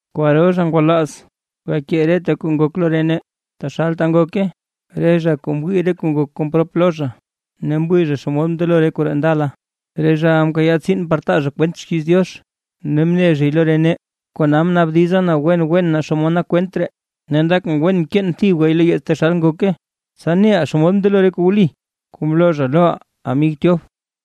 Kwaro zha ngwalaaz gakee reta kuu ngok lo re nee, taxal ngoke, re zha kuu mwii re kuu ngok kon prop lo zha, ne mwii zha xomod mndelo re koree ndala, re zhaʼa mkayaa tsiin par taa zha kwent xkiiz Diox, ne mne zhay lo re nee. Kona mnaabdiza na wen wen naa xomod nak kwent ree, ne ndakʼn wen keen thibgay lo yeets taxal ngoke, tsa neʼa xomod mndelo re kuu wli kuu mloo zha loʼa amig Tyof.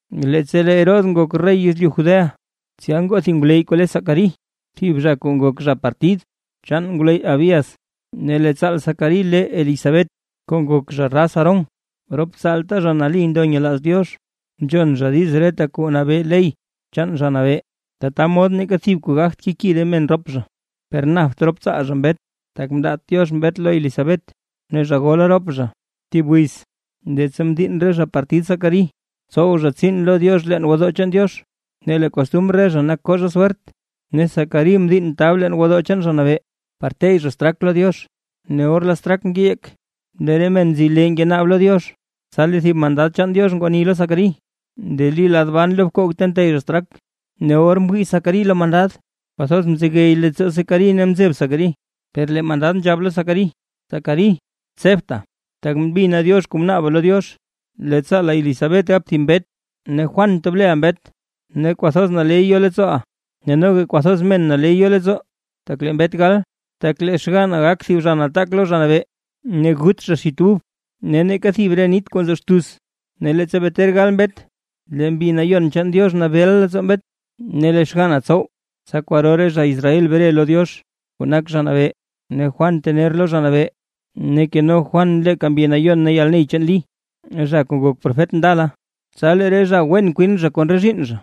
Leettsa lee Herodes nak rey yezlyu Judea, tsya ngoo thib ngwleyy kuu le Zacarí, thib zha kuu nak zha partid chaan ngwleyy Abías. Ne lee tsaal Zacarí le Elisabet kuu nak zha raz Aarón. Rop tsaalta zha nali ndo nyelaaz Diox, nzhon zha diiz reta kuu nabee ley chaan Zha Nabee, tata mod neeka thib kuu gagt keki re men rop zha. Per napt rop tsaal zha mbet, tak mndaat Diox mbet lo Elisabet, ne zha gola rop zha. Thib wiz, leettsa mdiinn re zha partid Zacarí tsow zha tsiin lo Diox leen gwodoo chaan Diox, ne lee kostumr re zha nak koo zha swert, ne Zacarí mdiinn tab leen gwodoo chaan Zha Nabee, par teyy zha straak lo Diox. Ne or lee straak ngeyeek, lee re men nzi lee ngenaab lo Diox. Tsa lee thib mandad chaan Diox ngwani lo Zacarí, ndeli lad ban lo bkoog ta nteyy zha straak. Ne or mwii Zacarí lo mandad, kwathoz mzegey leettsoo Zacarí ne mzeb Zacarí. Per lee mandad nzhab lo Zacarí: ―Zacarí, tsebta, tak mbina Diox kuu mnaaba lo Diox, lee tsaala Elisabet gap thib mbet, ne Juan tob leʼa mbet. Ne kwathoz naley yo leettsooʼa, ne noga kwathoz men naley yo leettsoo tak lee mbet gal, tak lee xganna gak thib zha nataak lo Zha Nabee. Ne gut zha xit ub ne neeka thib re nit kuu nzo xtuz, ne leettsa bee ter gal mbet lee Mbi Nayon chaan Diox nabeeʼa leettsoo mbet. Ne lee xganna tsow, tsa kwaro re zha Israel bre lo Diox kuu nak Zha Nabee. Ne Juan tener lo Zha Nabee, ne keno Juan leeka Mbi Nayon ne yalney chaan Lí, zha kuu ngok profet ndala. Tsa lee re zha wen kwin zha kon re zhiinn zha,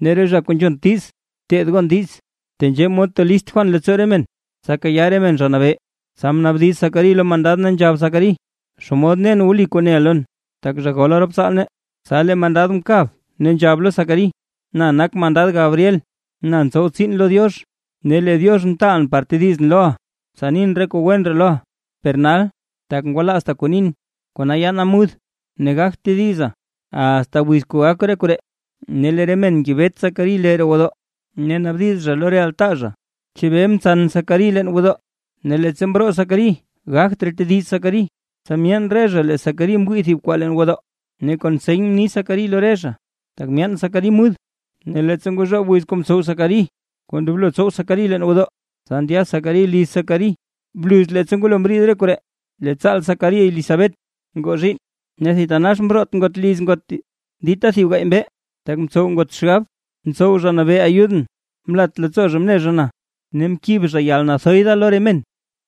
ne lee re zha kuu nzhont diiz, teed gon diiz. Tenzhee mod tolist Juan leettsoo re men, tsa kayaa re men Zha Nabee. Tsa mnaabdiz Zacarí lo mandad ne nzhab Zacarí: ―¿Xomod nen wli kuu neʼa lon? Tak zha gola rop tsaal nee. Tsa lee mandad mkab, ne nzhab lo Zacarí: ―Na nak mandad Gabriel, na ntsow tsiin lo Diox. Ne lee Diox mtaalʼn par tedizʼn loʼa, tsa nin re kuu wen ree loʼa. Per nal, tak ngwalaazta kuu nin, kona yaana mud, ne gagt tediza asta wiz kuu gak re koree. Ne lee re men ngebet Zacarí lee roo gwodoo, ne naabdiz zha lo re altaa zha, naa chebee ntsan Zacarí leen gwodoo. Ne leettsa mroo Zacarí gagt raa tediz Zacarí, tsa myeen re zha lee Zacarí mwii thib kwaa leen gwodoo, ne kon seny mni Zacarí lo re zha, tak myaan Zacarí mud. Ne leettsa ngozhoob wiz kuu mtsow Zacarí kuu ndoblo tsow Zacarí leen gwodoo, tsa ndya Zacarí liz Zacarí. Bluz leettsa ngwalo mriid re koree, lee tsaal Zacarí Elisabet ngoo zhiinn, ne thitanax mroot ngot liz ngot dita thib gaay mbee, tak mtsow ngot xgab: “Mtsow Zha Nabee ayudʼn, mlat leettsoo zha mne zha na, ne mkib zha yalnathoy da lo re men”.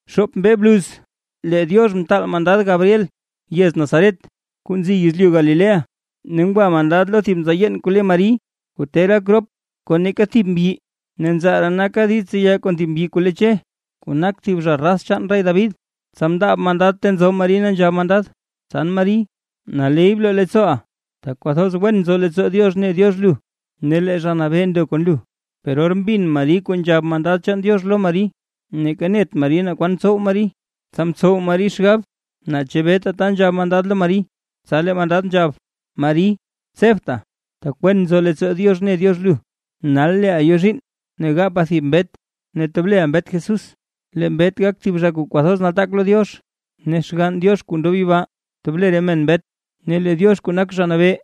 Xoop mbee bluz lee Diox mtaal mandad Gabriel yez Nazaret kuu nzi yezlyu Galilea, ne ngwa mandad lo thib nzaa yeen kuu le Mari, kuu ter gak rop kon neeka thib mbyi, ne nzaa ree naka diiz tseya kon thib mbyi kuu le Che, kuu nak thib zha raz chaan rey David. Tsa mndaab mandad ta nzo Mari ne nzhab mandad: ―¡Tsan Mari, naley bloo leettsooʼa, tak kwathoz wen nzo leettsoo Diox ne Diox lu! Ne lee Zha Nabee ndo kon lu. Per or mbin Mari kuu nzhab mandad chaan Diox lo Mari, neeka net Mari naa kwan tsow Mari, tsa mtsow Mari xgab na chebee tata nzhab mandad lo Mari. Tsa lee mandad nzhab: ―Mari, tsebta, tak wen nzo leettsoo Diox ne Diox lu. Nal lee lu yo zhiinn ne gapa thib mbet ne tob leʼa mbet Jesús. Lee mbet gak thib zha kuu kwathoz nataak lo Diox, ne Xgann Diox kuu ndob yibaa tob le re men mbet, ne lee Diox kuu nak Zha Nabee,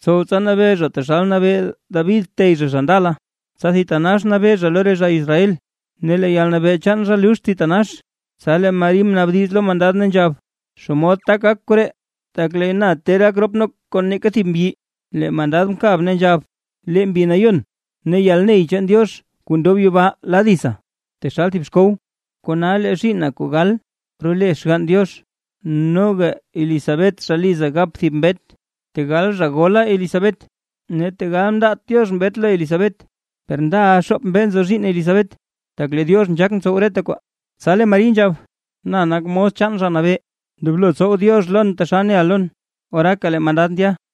tsow tsa nabee zha taxal mnabee David tey zha, zha ndala, tsa thitanax nabee zha lo re zha Israel. Ne lee yalnabee chaan zha luxt thitanax. Tsa lee Mari mnaabdiz lo mandad, ne nzhab: ―¿Xomod tak gak koree? Tak lee na ter gakʼn kon neeka thib mbyi. Lee mandad mkab, ne nzhab: ―Lee Mbi Nayon ne lee yalney chaan Diox kuu ndob yibaa la ditsa taxal thib xkow. Kona lee zhiinna kuu gal role Xgann Diox. Noga Elisabet zha liza gap thib mbet, tegal zha gola Elisabet, ne tegal mndaat Diox mbet lo Elisabet. Per ndaʼa xoop mbee nzo zhiinn Elisabet. Tak lee Diox nzhaak ntsow reta kwaa. Tsa lee Mari nzhab: ―Na nak mos chaan Zha Nabee, ndoblo tsow Diox lon taxal neʼa lon. Oraaka lee mandad ndya.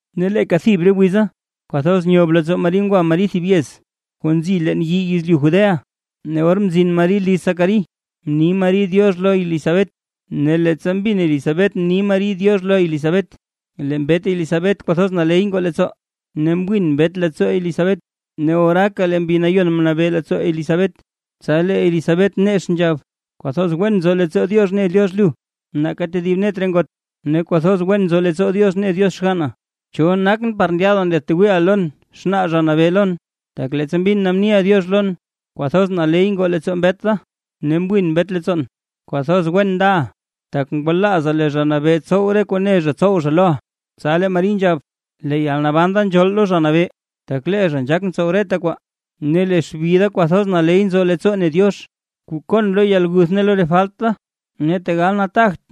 Ne leeka thib re wiza, kwathoz nyob leettsoo Mari ngwa Mari thib yez kuu nzi leen yii yezlyu Judea, ne or mzin Mari liz Zacarí, mni Mari “diox” lo Elisabet. Ne leettsa mbin Elisabet mni Mari “diox” lo Elisabet, lee mbet Elisabet kwathoz naley ngoo leettsoo, ne mwin mbet leettsoo Elisabet, ne oraaka lee Mbi Nayon mnabee leettsoo Elisabet. Tsa lee Elisabet nex nzhab: ―¡Kwathoz wen nzo leettsoo Diox ne Diox lu nake tedib net re ngot, ne kwathoz wen nzo leettsoo Diox ne Diox xganna! ¿Cho nakʼn par ndyaada ndyaadtwiiʼa lon xnaa Zha Nabee lon? Tak leettsa mbin na mniʼa “diox” lon, kwathoz naley ngoo leettsoo mbet da ne mwiin mbet leettsoon. ¡Kwathoz wen ndaʼa, tak ngwalaaza lee Zha Nabee tsow re kuu ne zha tsow zha loʼa! Tsa lee Mari nzhab: Lee yalnaban da nzhool lo Zha Nabee, tak lee zha nzhaak ntsow reta kwaa, ne lee xbi da kwathoz naley nzo leettsoo ne Diox, kuu koon lo yalguth ne lo re falt da. Ne tegal nataagt,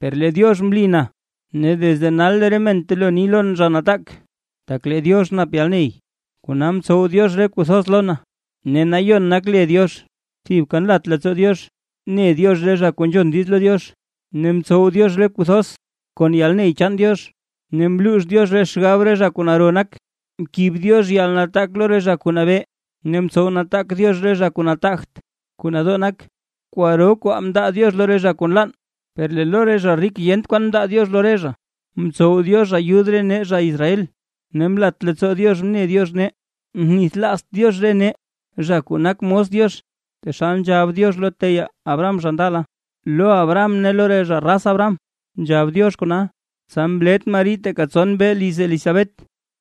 per lee Diox mlin, ne desde nal lee re men telo ni lon zha nataak, tak lee Diox nap yalney, kona mtsow Diox re kuu thoz lon. ¡Ne Nayon nak le Diox! Thibka nlat leettsoo Diox ne Diox re zha kuu nzhon diiz lo Diox. Ne mtsow Diox re kuu thoz, kon yalney chaan Diox. Ne mluux Diox re xgab re zha kuu naro nak. Mkib Diox yalnataak lo re zha kuu nabee, ne mtsow nataak Diox re zha kuu nataagt, kuu nadoo nak. Kwaro kwaa mndaa Diox lo re zha kuu nlann, per lee lo re zha rik yent kwan mndaa Diox lo re zha. Mtsow Diox ayud re nee, zha Israel, ne mlat leettsoo Diox mne Diox nee, mnithlaazt Diox re nee zha kuu nak mos Diox, taxal nzhab Diox lo teyaa Abraham zha ndala, lo Abraham ne lo re zha raz Abraham. Tsa mlet Mari teeka tson mbee liz Elisabet,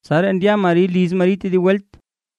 tsaraa ndya Mari liz Mari tedib welt.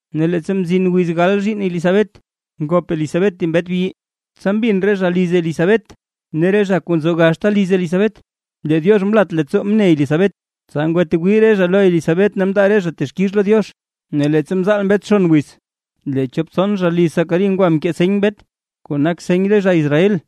Ne leettsa mzin wiz gal zhiinn Elisabet, ngop Elisabet thib mbet bi. Tsa mbin re zha liz Elisabet ne re zha kuu nzo gaxta liz Elisabet, lee Diox mlat leettsoo mne Elisabet, tsa ngwatwii re zha lo Elisabet ne mndaa re zha texkix lo Diox. Ne leettsa mzaal mbet xon wiz, lee chop tson zha liz Zacarí ngwa mkee seny mbet, kuu nak seny re zha Israel.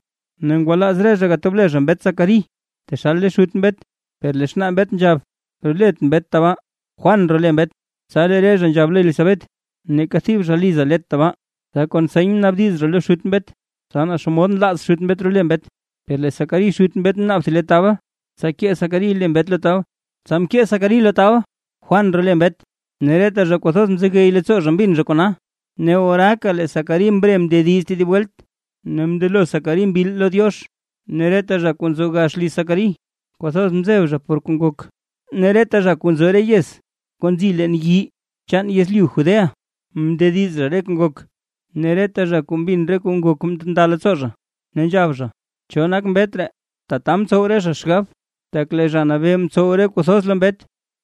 Ne ngwalaaz re zha gatob le zha mbet Zacarí taxal le xut mbet. Per lee xnaa mbet nzhab: ―Rolet mbet tabaa, Juan role mbet. Tsa lee re zha nzhab lo Elisabet: ―Neeka thib zha liza let tabaa. Tsa kon seny mnaabdiz zha lo xut mbet, tsa naa xomod nlaaz xut mbet role mbet. Per lee Zacarí xut mbet mnaab thib le tabl, tsa kee Zacarí lee mbet lo tabl, tsa mkee Zacarí lo tabl: “Juan role mbet”. Ne reta zha kwathoz mzegey leettsoo zha mbin zha kona. Ne oraaka lee Zacarí mre mndediz tedib welt, ne mndelo Zacarí mbil lo Diox. Ne reta zha kuu nzo gax liz Zacarí kwathoz mzeb zha por kuu ngok, ne reta zha kuu nzo re yez kuu nzi leen yii chaan yezlyu Judea, mndediz zha re kuu ngok. Ne reta zha kuu mbin re kuu ngok nda leettsoo zha, ne nzhab zha: “¿Cho nak mbet ree?” Tata mtsow re zha xgab, tak lee Zha Nabee mtsow re kuu thoz lo mbet.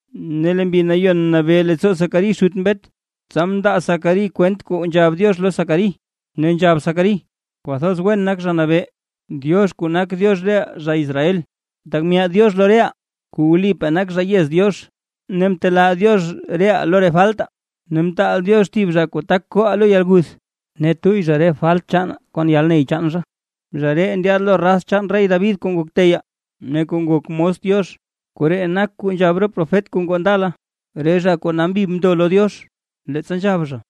Ne lee Mbi Nayon mnabee leettsoo Zacarí xut mbet, tsa mndaa Zacarí kwent kuu nzhab Diox lo Zacarí, ne nzhab Zacarí: ¡Kwathoz wen nak Zha Nabee, Diox kuu nak Diox reʼaa zha Israel, tak myaad Diox lo reʼaa kuu wlipaa nak zha yez Diox, ne mtelaa Diox reʼaa lo re faltaa! Ne mtaal Diox thib zha kuu tak kooʼaa lo yalguth, ne tuyy zha re falt chaanaa kon yalney chaan zha. Zha ree ndyaad lo raz chaan rey David kuu ngok teyaa, ne kuu ngok mos Diox. Koree nak kuu nzhab re profet kuu ngoo ndala, re zha kuu nambi mndo lo Diox. Leettsa nzhab zha: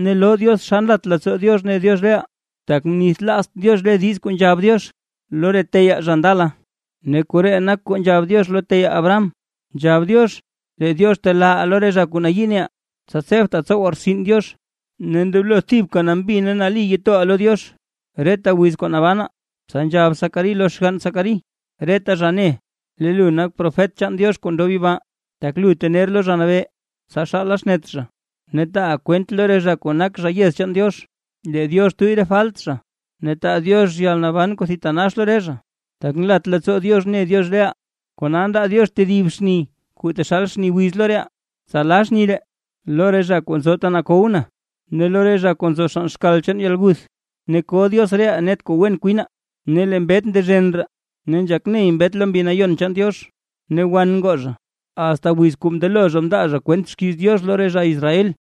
Ne loo Diox xa nlat leettsoo Diox ne Diox reʼaa, tak mnithlaazt Diox re diiz kuu nzhab Diox lo re teyaa, zha ndala. Ne koree nak kuu nzhab Diox lo teyaa Abraham: Nzhab Diox lee Diox telaaʼaa lo re zha kuu nayii neʼaa, tsa tsebtaa tsowaa rtsin Diox. Ne ndoblo thibka nambi ne nali toʼaa lo Diox, reta wiz kuu nabanaa. Tsa nzhab Zacarí lo xgann Zacarí: “Lee lu nak profet chaan Diox kuu ndob yibaa, tak lu tener lo Zha Nabee, tsa xaala xnet zha, ne taaʼa kwent lo re zha kuu nak zha yez chaan Diox, lee Diox tuyy re falt zha, ne taa Diox yalnaban kuu thitanax lo re zha. Tak nlat leettsoo Diox ne Diox reʼaa, kona ndaa Diox tedib xni kuu taxal xni wiz lo reʼaa, tsa la xni ree lo re zha kuu nzo lo yalkow, ne lo re zha kuu nzo xann xkal chaan yalguth, ne ko Diox reʼaa net kuu wen kwinaa.” Ne lee mbet ndezhen raa ne nzhak ney mbet lo Mbi Nayon chaan Diox, ne wan ngoo zha, asta wiz kuu mndelo zha mndaa kwent xkiiz Diox lo re zha Israel.